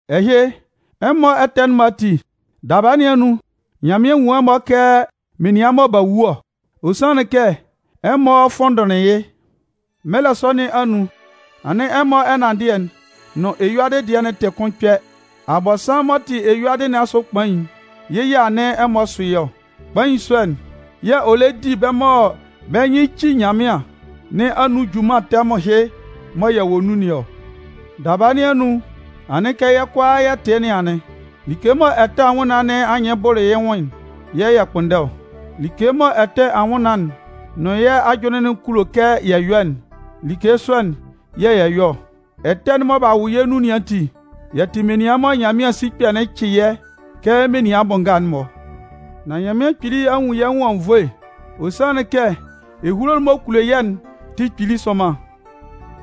Ɛhɩ, ɛmɔ ɛtɛ'n-mɔ ati, daba nɩn anun, Nyanmɩan nwun ɛmɔ kɛ menian mɔ b'a wu ɔ. Ɔ sanlɩn kɛ ɛmɔ fʋnndʋnlɩn yɩ́. Mɛlɛ sɔ nɩn anun, anɩn ɛmɔ ɛnanndɩɛ'n nʋn eyuadɩ dɩɛ'n tɩ kʋn kpɛ. Abɔnsanmʋn m'ɔ tɩ eyuadɩ nɩn asʋ kpain'n, yɩ́ yɛ̂ anɩn ɛmɔ sʋ yɩ́ ɔ. Kpain sɔ'n yɛ̂ ɔ lɛ di bɛ́ mɔ bɛ́ nyɩn ci Nyanmɩan nɩn anun junman tɛmʋn ɛhɩ mɔ yɛ wɔ nun nɩn ɔ. Daba nɩn anun, anɩn kɛ yɛ́ kʋalaa yɛ tɩ yɩ́ nɩn anɩn. Like mɔ ɛtɛ anwʋnnaan nɩn anyɩn bʋlʋ yɩ́ nwʋn'n yɛ̂ yɛ kpʋnndɛ ɔ. Like mɔ ɛtɛ anwʋnnaan'n nʋn yɛ́ ajʋnlɩn'n kulo kɛ yɛ yɔ́'n, like sɔ'n yɛ̂ yɛ yɔ ɔ. Ɛtɛ'n mɔ b'a wʋ yɛ́ nʋn nɩn ati, yɛ́ tɩ menian mɔ Nyanmɩan sikpɛ'n cɩ yɛ́ kɛ menian bʋ nga'n-mɔ. Nan Nyanmɩan Kpili a nwun yɛ́ nwʋn anwunnvoe. Ɔ sanlɩn kɛ ehulo'n m'ɔ kulo yɛ́'n tɩ kpili sʋnman.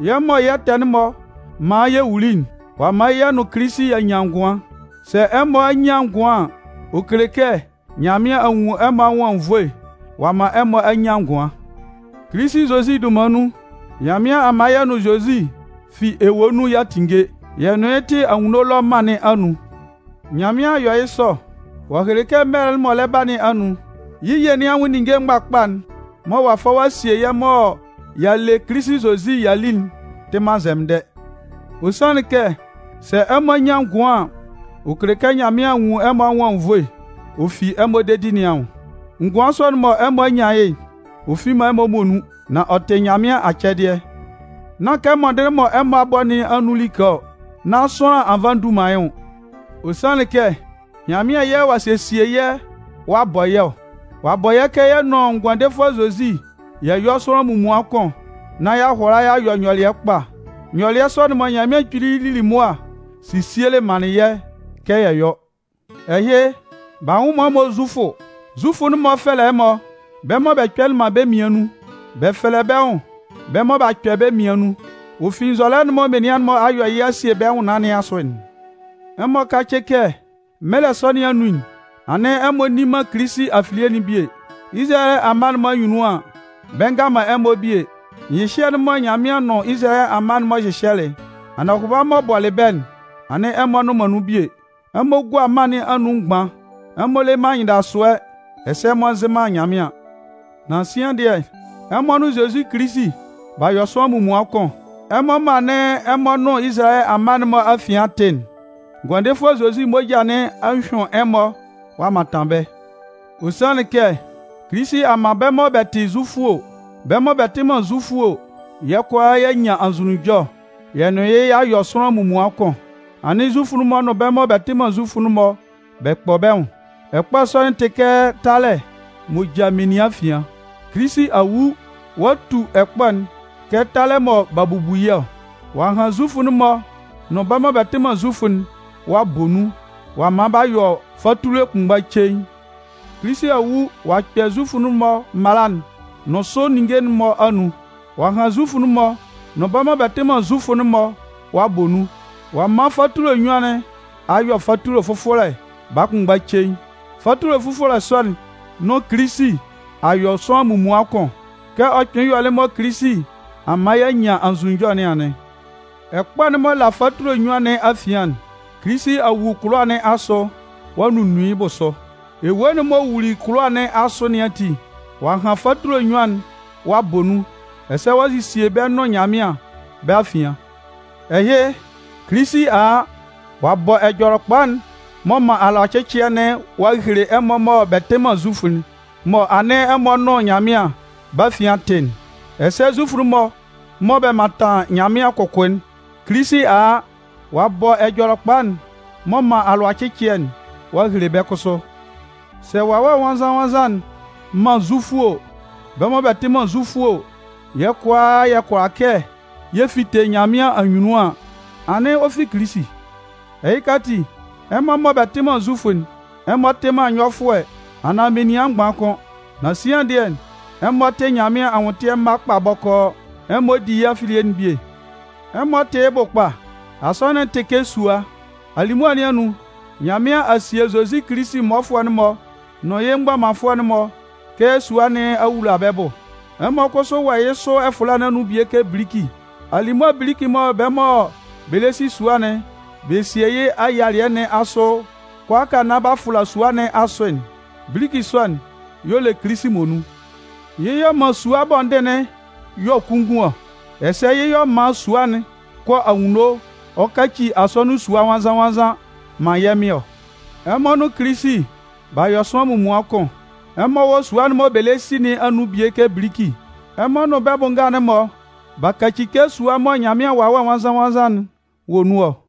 Yɛ́ mɔ yɛ́ ɛtɛ'n-mɔ man yɛ wuli'n, ɔ'a man yɛ́ nʋn Kilisi y'a nyan ngʋan. Sɛ ɛmɔ a nyan ngʋan an, ɔ kele kɛ Nyanmɩan a nwun ɛmɔ anwʋn anwunnvoe ɔ'a man ɛmɔ a nyan ngʋan. Kilisi Zozi dunman nun, Nyanmɩan a man yɛ́ nʋn Zozi fi ewue nun y'a tinnge, yɛ́ nʋn yɩ́ tɩ anwunno ɛlɔ mân nɩn anun. Nyanmɩan a yɔ yɩ́ sɔ, ɔ'a hele kɛ mɛlɛ'n m'ɔ lɛ ba nɩn anun, yɩ́ ye nɩn anwʋn ninnge mgbakpa'n mɔ ɔ'a fa ɔ'a sie yɛ́ mɔ y'a le Kilisi Zozi y'a li'n tɩ man nzɛmɩndɛ. Ɔ sanlɩn kɛ, sɛ ɛmɔ a nyan ngʋan an, ɔ kele kɛ Nyanmɩan a nwun ɛmɔ anwʋn anwunnvoe, ɔ fi ɛmɔ dedi nɩn anwʋn. Ngʋan sɔ'n mɔ ɛmɔ a nyan yɩ́'n, ɔ fi man ɛmɔ muonun. Nan ɔ tɩ Nyanmɩan acɛdɩɛ. Nán kɛ mɔndɩnlɩn mɔ ɛmɔ a bɔ nɩn anun like ɔ, nán sʋanlan a fa a tu yɩ́ nwʋn. Ɔ sanlɩn kɛ Nyanmɩan yɛ̂ ɔ'a sesie yɛ́ ɔ'a bɔ yɛ́ ɔ. Ɔ'a bɔ yɛ́ kɛ yɛ nʋn Ngʋandefʋɛ Zozi yɛ yɔ́ sʋanlan munmuan kʋn nán y'a hʋala y'a yɔ nyɔlɩɛ kpa. Nyɔlɩɛ sɔ'n-mɔ, Nyanmɩan Kpili lili mʋa sesielɩ manlɩn yɛ́ kɛ yɛ yɔ́. Ɛhɩ, b'a nwʋ man ɛmɔ Zufʋ. Zufʋ'n-mɔ fɛlɛ ɛmɔ “bɛ́ mɔ bɛ kpɛlɩ man bɛ́ mmian nun”. Bɛ fɛlɛ bɛ́ nwʋn “bɛ́ mɔ b'a kpɛ bɛ́ mmian nun”, ɔ fi nzɔlɛ'n mɔ menian'n-mɔ a yɔ a sie yɩ́ bɛ́ nwʋnnaan nɩn asʋ'n. Ɛmɔ kácɩ kɛ mɛlɛ sɔ nɩn anun'n anɩn ɛmɔ nni man Kilisi afilie'n bie. Izalayɛ amma'n-mɔ anyunnun an, bɛ nga man ɛmɔ bie. Nyɩhyɛ'n mɔ Nyanmɩan nʋn Izalayɛ amma'n-mɔ hyɩhyɛlɩ'n, anɔhʋba'n m'ɔ bɔlɩ bɛ́'n, anɩn ɛmɔ nnʋn man nun bie. Ɛmɔ gua mân nɩn anun mgban, ɛmɔ le man anyɩndasʋɛ, ɛsɛ ɛmɔ nzɩ man Nyanmɩan. Nan sian dɩɛ, ɛmɔ nʋn Zozi Kilisi b'a yɔ sʋanlan munmuan kʋn. Ɛmɔ mɔ anɩn ɛmɔ nʋn Izalayɛ amma'n-mɔ afian tɩ'n, Ngʋandefʋɛ Zozi moja nɩn a hyʋɩn ɛmɔ ɔ'a mantan bɛ́. Ɔ sanlɩn kɛ Kilisi a man bɛ́ mɔ bɛ tɩ Zufʋ o, bɛ́ mɔ bɛ tɩ man Zufʋ o, yɛ́ kʋalaa y'a nyan anzʋnunjɔ, yɛ nʋn yɩ́ y'a yɔ sʋanlan munmuan kʋn. Anɩn Zufʋ'n-mɔ nʋn bɛ́ mɔ bɛ tɩ man Zufʋ'n bɛ kpɔ bɛ́ nwʋn. Ɛkpɔ sɔ'n tɩ kɛ talɛ m'ɔ ja menian afian. Kilisi a wu ɔ'a tu ɛkpɔ'n kɛ talɛ mɔ b'a bubu yɩ́ ɔ. Ɔ'a han Zufʋ'n-mɔ nʋn bɛ́ mɔ bɛ tɩ man Zufʋ'n ɔ'a bɔ nun, ɔ'a man b'a yɔ fatule kʋnmgba cein. Kilisi a wu ɔ'a kpɛ Zufʋ'n-mɔ mala'n nʋn sʋ ninnge'n-mɔ anun. Ɔ'a han Zufʋ'n-mɔ nʋn bɛ́ mɔ bɛ tɩ man Zufʋ'n ɔ'a bɔ nun. Ɔ'a man fatule nnyuan nɩn a yɔ fatule fʋfɔlɛ baa kʋnmgba cein. Fatule fʋfɔlɛ sɔ'n nʋn Kilisi a yɔ sʋanlan munmuan kʋn. Kɛ ɔ kpɩnlɩn yɔlɩ mɔ Kilisi a man y'a nyan anzʋnunjɔ nɩn anɩn. Ɛkpɔ'n m'ɔ la fatule nnyuan nɩn afian'n, Kilisi a wu kʋlʋwa nɩn asʋ ɔ'a nunnun yɩ́ bʋsʋ. Ewue'n m'ɔ wuli kʋlʋwa nɩn asʋ nɩn ati, ɔ'a han fatule nnyuan'n, ɔ'a bɔ nun, ɛsɛ ɔ'a sesie bɛ́ nʋn Nyanmɩan bɛ́ afian. Ɛhɩ, Kilisi a a, ɔ'a bɔ Ɛjɔlɛkpa'n m'ɔ man alʋacɩcɩɛ'n nɩn ɔ'a hele ɛmɔ mɔ bɛ tɩ man Zufʋ mɔ anɩn ɛmɔ nʋn Nyanmɩan bɛ́ afian tɩ'n. Ɛsɛ Zufʋ'n-mɔ mɔ bɛ mantan Nyanmɩan kʋkʋ'n, Kilisi a a, ɔ'a bɔ Ɛjɔlɛkpa'n m'ɔ man alʋacɩcɩɛ'n ɔ'a hele bɛ́ kʋsʋ. Sɛ Wawɛ Nwannzan-nwannzan'n man Zufʋ o, bɛ́ mɔ bɛ tɩ man Zufʋ o, yɛ́ kʋalaa yɛ kʋala kɛ yɛ fite Nyanmɩan anyunnun an, anɩn ɔ fi Kilisi. Ɛhɩka ati, ɛmɔ mɔ bɛ tɩ man Zufʋ'n, ɛmɔ tɩ man nyɔfʋɛ anaan menian mgban kʋ́n. Nan sian dɩɛ, ɛmɔ tɩ Nyanmɩan anwʋntɩɛ mma kpa bɔkɔɔ, ɛmɔ di yɩ́ afilie'n bie. Ɛmɔ tɩ́ yɩ́ bʋ kpa. Asɔnɩn'n tɩ kɛ sua. Alimʋa nɩn anun, Nyanmɩan a sie Zozi Kilisi mmɔfʋɛ'n-mɔ nʋn yɩ́ mgbɔmanfʋɛ'n-mɔ kɛ sua nɩn awula bɛ́ bʋ. Ɛmɔ kʋsʋ wɔ yɩ́ sʋ ɛfʋla nɩn anun bie kɛ biliki. Alimʋa biliki'n mɔ bɛ́ mɔ bɛ lɛ si sua'n bɛ sie yɩ́ ayialɩɛ nɩn asʋ kʋalaaka nán b'a fʋla sua nɩn asʋ'n, biliki sɔ'n y'ɔ le Kilisi muonun. Yɩ́ y'ɔ man sua bɔndin'n yɔ kunngun ɔ. Ɛsɛ yɩ́ y'ɔ man sua'n kɔ anwunno ɔ kaci asɔnɩn sua nwannzan-nwannzan man yɛ́ Mɩn ɔ. Ɛmɔ nʋn Kilisi, b'a yɔ sʋanlan munmuan kʋn. Ɛmɔ wɔ sua'n mɔ bɛ lɛ si nɩn anun bie kɛ biliki. Ɛmɔ nʋn bɛ́ bʋ nga'n-mɔ b'a kaci kɛ sua mɔ Nyanmɩan Wawɛ Nwannzan-nwannzan'n wɔ nun ɔ.